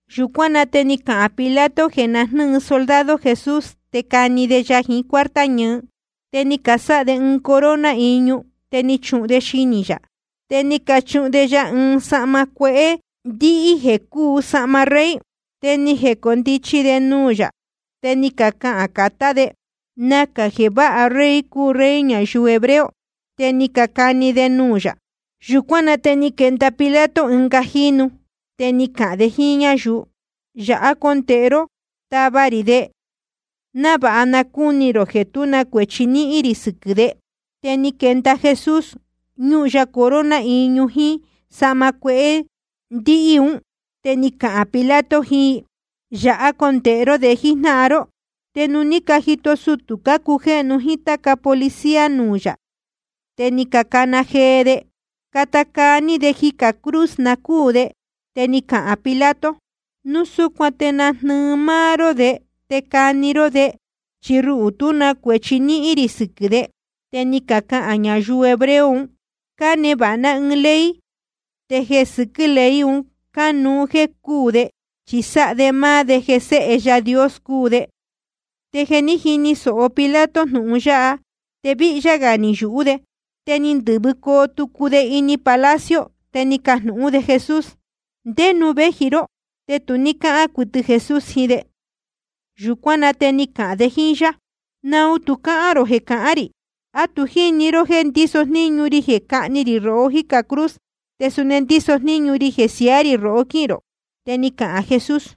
Yūcuán na te ni cahān Pilato jeē na jnɨ́ɨ soldado Jesús, te cani de ya jiín cuarta ñɨɨ. Te ni casáha de ɨɨn corona iñu, ni cachuhun de xinī yā. Te ni cachuhun de ya ɨɨn sahma cuehé ndíhí jéē cúu sahma rey. Te ni jecondichi de nuū yā, te ni cacahān catá de: Nacā jeē váha rey cúu Rey ñayuu hebreo. Te ni cacani de nuū yā. Yūcuán na te ni quenda Pilato ɨnga jínu, te ni cahān de jíín ñáyuu: Yāhá condēhe ró tava rī de, návāha na cúni rō jeē tú na cuēchi níhín rī sɨquɨ̄ de. Te ni quenda Jesús, ñúhun ya corona iñu jíín sahma cuehé ndíhí un. Te ni cahān Pilato jiín i: Yāhá condēhe ró de jíjnáhan ró. Te nuū ní cajito sutū cácujéhnu jíín táca policía nuū yā, te ni cacana jee de: Cata caa ní de jicā cruz, na cúū de. Te ni cahān Pilato: Núu súcuan te najnɨɨ máá ró de te cahni rō de. Chi ruhū, tú na cuēchi níhín rī sɨquɨ̄ de. Te ni cacahān ñayuu hebreo un: Cánevāha ná ɨɨn ley, te jeē sɨquɨ́ ley un cánuú jéē cúū de, chi sáha de máá de jeē Séhe Yaā Dios cúu de. Te jeē ní jini sōho Pilato jnūhun yáha, te víhyá gā ni yūhú de. Te ni ndɨ̄vɨcoo tucu de ini palacio, te ni cajnūhún de Jesús: ¿Ndé nuū véji ró? Te tu ní cáhán cuɨtɨ Jesús jiín de. Yūcuán na te ni cahān de jíín yá: ¿Naun tu cáhán rō jeē cahán rī? ¿A tu jíní rō jeē ndíso jníñu ri jeē cáhni rī rohó jícā cruz, te suni ndíso jníñu ri jeē siaá rī rohó quíhīn rō? Te ni cahān Jesús: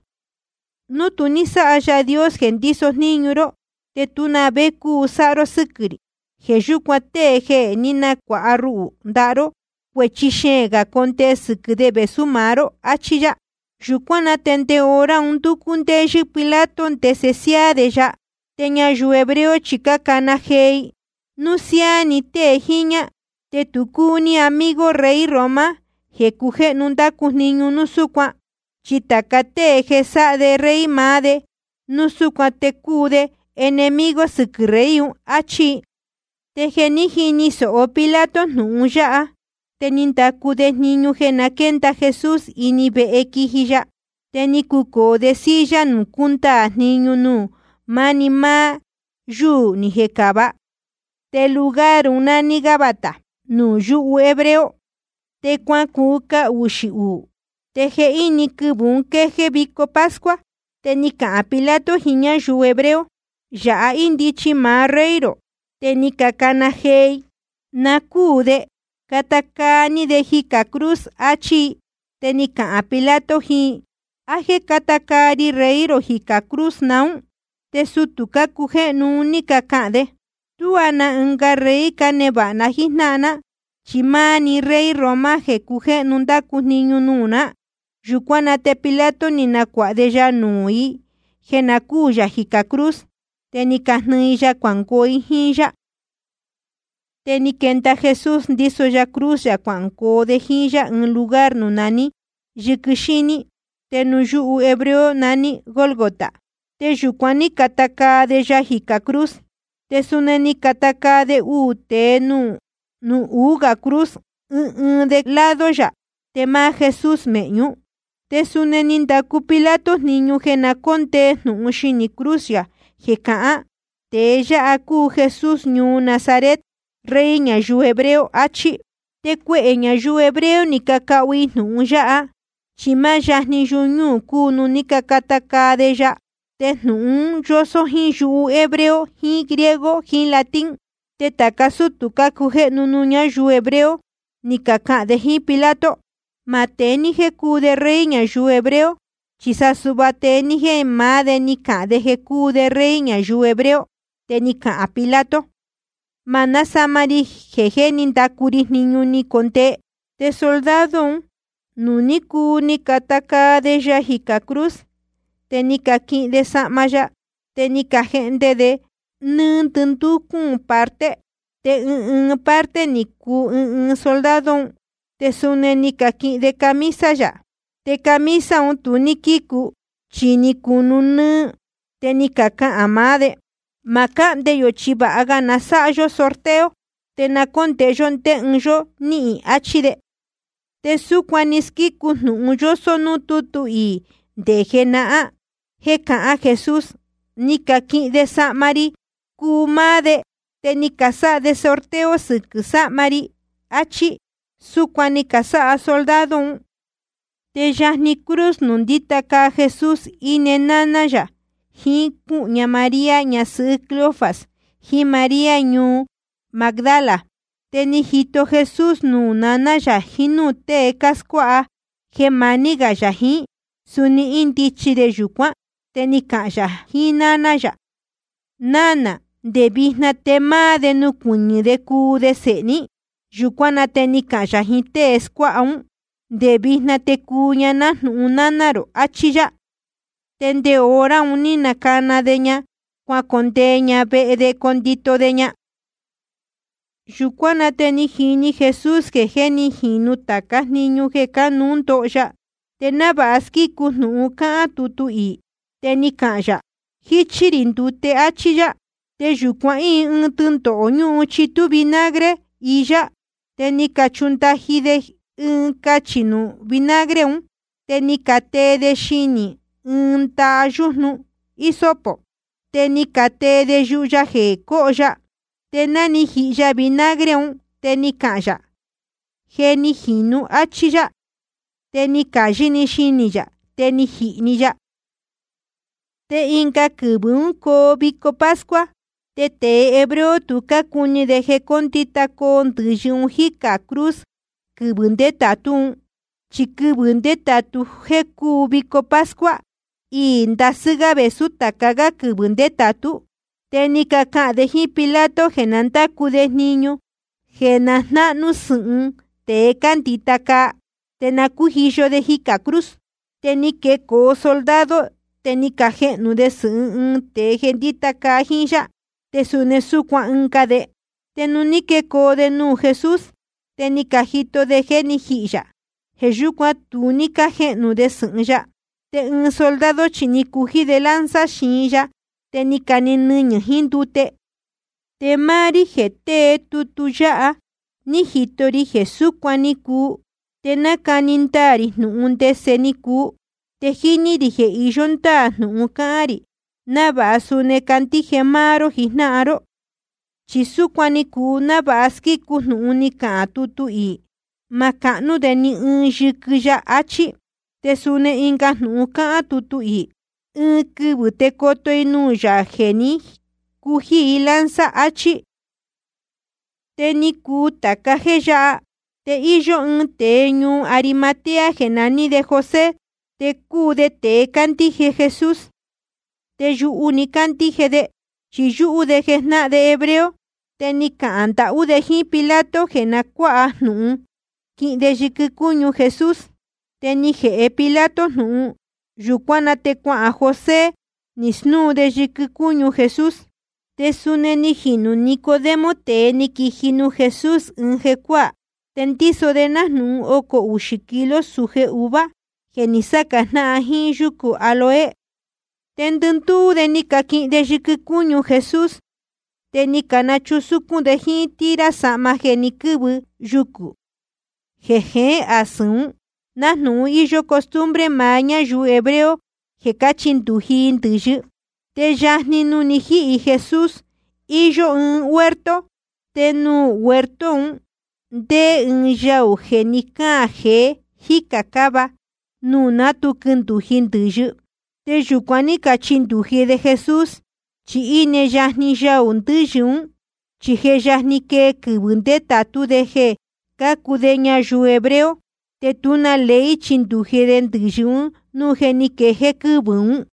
Núu tu ní sáha Yaā Dios jeē ndíso jníñu ró, te tú na vé cúu sáha ró sɨ́quɨ̄ rī. Jeē yúcuan tēe jeē ní nacuāha ruhū ndaha ró, cuēchi xeēn gā condee sɨquɨ̄ de vēsú maá ró. Achí yá. Yūcuán na te nde hora un ndúcú ndéyɨ́ Pilato ndese siáá de ya. Te ñayuu hebreo chi cácana jee i: Núu siáá ni tée jiñā, te tu cúu ní amigo rey Roma jeē cujéhnu ndácu jniñu núu súcuan. Chi tāca tée jeē sáha de rey maá de, núu súcuan te cúu de enemigo sɨquɨ̄ rey un. Achí i. Te jeē ní jini sōho Pilato jnūhun yáha, te ni ndacu de jniñu jeē na quénda Jesús ini vehe quiji ya. Te ni cucōo de silla nuū cúndaā jniñu, nuū máni máá yúū ni jecāva, te lugar un nání Gabata nuū yúhu hebreo. Te cuacuu cahuxī uū, te jehíni quɨvɨ̄ ún quejéé vico pascua. Te ni cahān Pilato jiín ñáyuu hebreo: Yāha índichi maá rey rō. Te ni cacana jee i: Na cúū de. Cata caa ní de jicā cruz, achí i. Te ni cahān Pilato jiín i: ¿A jéē cata caa rī rey rō jicā cruz naún? Te sutū cácujéhnu un ní cacahān de: Tuá na ɨnga rey cánevāha ná jíjnáhan ná, chi máá‑ni rey Roma jeē cujéhnu ndácu jniñu nuū ná. Yūcuán na te Pilato ni nacuāha de ya nuū i jeē na cúū yā jicā cruz. Te ni cajnɨɨ i ya cuangoo i jíín yá. Te ni quenda Jesús, ndíso ya cruz yā, cuangoo de jíín yá ɨɨn lugar nuū naní Yɨquɨ Xíní, te nuū yúhu hebreo naní Gólgota. Te yūcuan ní cacata caa de ya jicā cruz. Te suni ni cacata caa de uū tēe nuū uū gā cruz, ɨɨn ɨɨn de ɨɨn lado yā, te máá Jesús mēhñú. Te suni ni ndacu Pilato jniñu jeē na cóndee jnūhun xinī cruz yā, jeē cahán: Tēe yáha cúu Jesús ñuu Nazaret, Rey ñayuu hebreo, achí. Te cuehē ñayuu hebreo ni cacahu i jnūhun yáha, chi máá yajni yuñúū cúu nuū ní cacata caa de ya. Te jnūhun un yósó jíín yuhu hebreo jiín griego jiín latín. Te tāca sútū cácujéhnu nuū ñáyuu hebreo, ni cacahān de jíín Pilato: Ma tée ní jéē cúu de Rey ñayuu hebreo, chi sa suhva tee ní jéē maá de ni cahān jeē cúu de Rey ñayuu hebreo. Te ni cahān Pilato: Ma násama ri jeē jé ni ndacu ri jniñu ni jecondee. Te soldado un, nuū ní cuu ni cacata caa de Jesús jicā cruz, te ni caquihin de sahma ya, te ni cajehnde de ni nduu cuūn parte, te ɨɨn ɨɨn parte ni cuu ɨɨn ɨɨn soldado un. Te suni ni caquihin de camisa yā. Te camisa un tu ní quícu, chi ni cunu nɨ́ɨ́. Te ni cacahān maá de: Ma cáhnde yō, chi vāha ga na sáha yó sorteo, te na cóndēhe yó ndé ɨɨn yó níhīn, achí de. Te súcuan ni squícu jnūhun yósó núū tútu iī nde jenahán jéē cahān Jesús: Ni caquihin de sahma ri cuu máá de. Te ni casáha de sorteo sɨquɨ̄ camisa rī. Achí. Súcuan ni casáha soldado un. Te yajni cruz nuū ndíta caa Jesús íne náná yā, jiín cúhū ña María ñasɨhɨ́ Cleofas, jiín María ñuu Magdala. Te ni jito Jesús nuū naná yā jiín núū tée scuáha jeē maní gā yā jiín, suni índichi de yūcuán. Te ni cahān yā jiín náná yā: Nánā, nde vijna te máá de nucuɨñɨ̄ de cuu de sēhe ní. Yūcuán na te ni cahān yā jiín tée scuáha ún: Nde vijna te cuu ña nájnūhun náná rō, achí yá. Te nde hora un ní cana de ña cuacondee ña vehe de condito de ña. Yūcuán na te ni jini Jesús jeē jé ni jīnu tācá jniñu jeē cánuú ndoho ya. Te návāha squícu jnūhun cáhán tutu iī, te ni cahān yā: Jíchí rī ndute, áchí yá. Te yūcuan íin ɨɨn tɨndohō ñúhun chitú vinagre iyá. Te ni cachundaji de ɨɨn cachī nuū vinagre un, te ni catee de xinī ɨɨn ndaha yújnu hisopo, te ni catee de yuhu ya jeē cóho ya. Te ná ni jihi ya vinagre un, te ni cahān yā: Je ni jīnu, áchí yá. Te ni cāyɨ́‑ni xinī yā, te ni jihī‑ni ya. Te ɨnga quɨvɨ̄ ún coo vico pascua. Te tēe hebreo tu cácuni de jeē cóndita caa ndɨ̄yɨ ún jícā cruz quɨvɨ̄ ndétātú un. Chi quɨvɨ̄ ndétātú jeē cúu vico pascua, iī ndasɨ́ gá vēsú tāca gá quɨvɨ̄ ndétātú. Te ni cacahān de jíín Pilato jeē na ndácu de jniñu jeē jnahnú sɨ̄hɨn tēe cándita caa, te na cújiyo de jicā cruz. Te ni quecoo soldado, te ni cajehnū de sɨ̄hɨn ɨɨn tēe jeē ndíta caa jíín yá, te suni súcuan ɨnga de. Te nuū ní quecoo de nuū Jesús, te ni cajito de jeē jé ni jihī yā. Jeē yúcuan tu ní cájehnū de sɨ̄hɨn ya. Te ɨɨn soldado chi ni cují de lanza xiin ya, te ni cane‑ni nɨñɨ̄ jiín ndute. Te máá rí jeē tée tutu yáha, ni jito ri jeē súcuan ni cuu, te nácani ndaā rī jnūhun ndese ni cuu. Te jíní rī jeē iyó ndáā jnūhun cáhán rī, návāha suni candíje máá ró jijnáhan ró. Chi súcuan ni cuu návāha squícu jnūhun cáhán tutu iī: Ma cahnú de ni ɨɨn yɨquɨ ya, achí. Te suni ɨnga jnūhun cáhán tutu iī: Ɨɨn quɨvɨ̄ te coto i nuū Yaā jeē ní cují i lanza, achí. Te ni cuu tāca jéē yáha. Te íyó ɨɨn tēe ñuu Arimatea jeē naní José, te cúu de tēe cándíje Jesús. Te yuhu‑ni cándíje de, chi yúhú de jnáhan de hebreo. Te ni cahān ndahú de jíín Pilato jeē na cuáha jnūhun quihin de yɨquɨ cúñu Jesús. Te ni jēhe Pilato jnūhun. Yūcuán na te cuahān José, ni snúu de yɨquɨ cúñu Jesús. Te suni ni jinū Nicodemo, tēe ni quiji nuū Jesús ɨɨn jecuáā. Te ndíso de nájnūhun ocō uxī kilo sūje uvuā jeē ní saca jnáhan jíín yúcū áloe. Te ndɨndúú de ni caquihin de yɨquɨ cúñu Jesús, te ni cachusúcún de jíín tira sahma jeē ni quɨ́vɨ yucū jeē jeén asɨ̄n ún, nájnūhun íyó costumbre maá ñáyuu hebreo jeē cáchindūji i ndɨ̄yɨ. Te yajni nuū ni jíhī Jesús íyó ɨɨn huerto. Te nuū huerto un ndéé ɨɨn yaū jeē ní caan jeé jicā ɨɨn cava, nuū ná tu quindūji ndɨ̄yɨ. Te yūcuan ní cachindūji de Jesús, chi íne yajni yaū ndɨ̄yɨ ún. Chi je yajni quejéé quɨ́vɨ̄ ndétātú de jeē cácuu de ñayuu hebreo, te tú na ley chindūji de ndɨ̄yɨ núu je ni quejéé quɨ́vɨ̄ ún.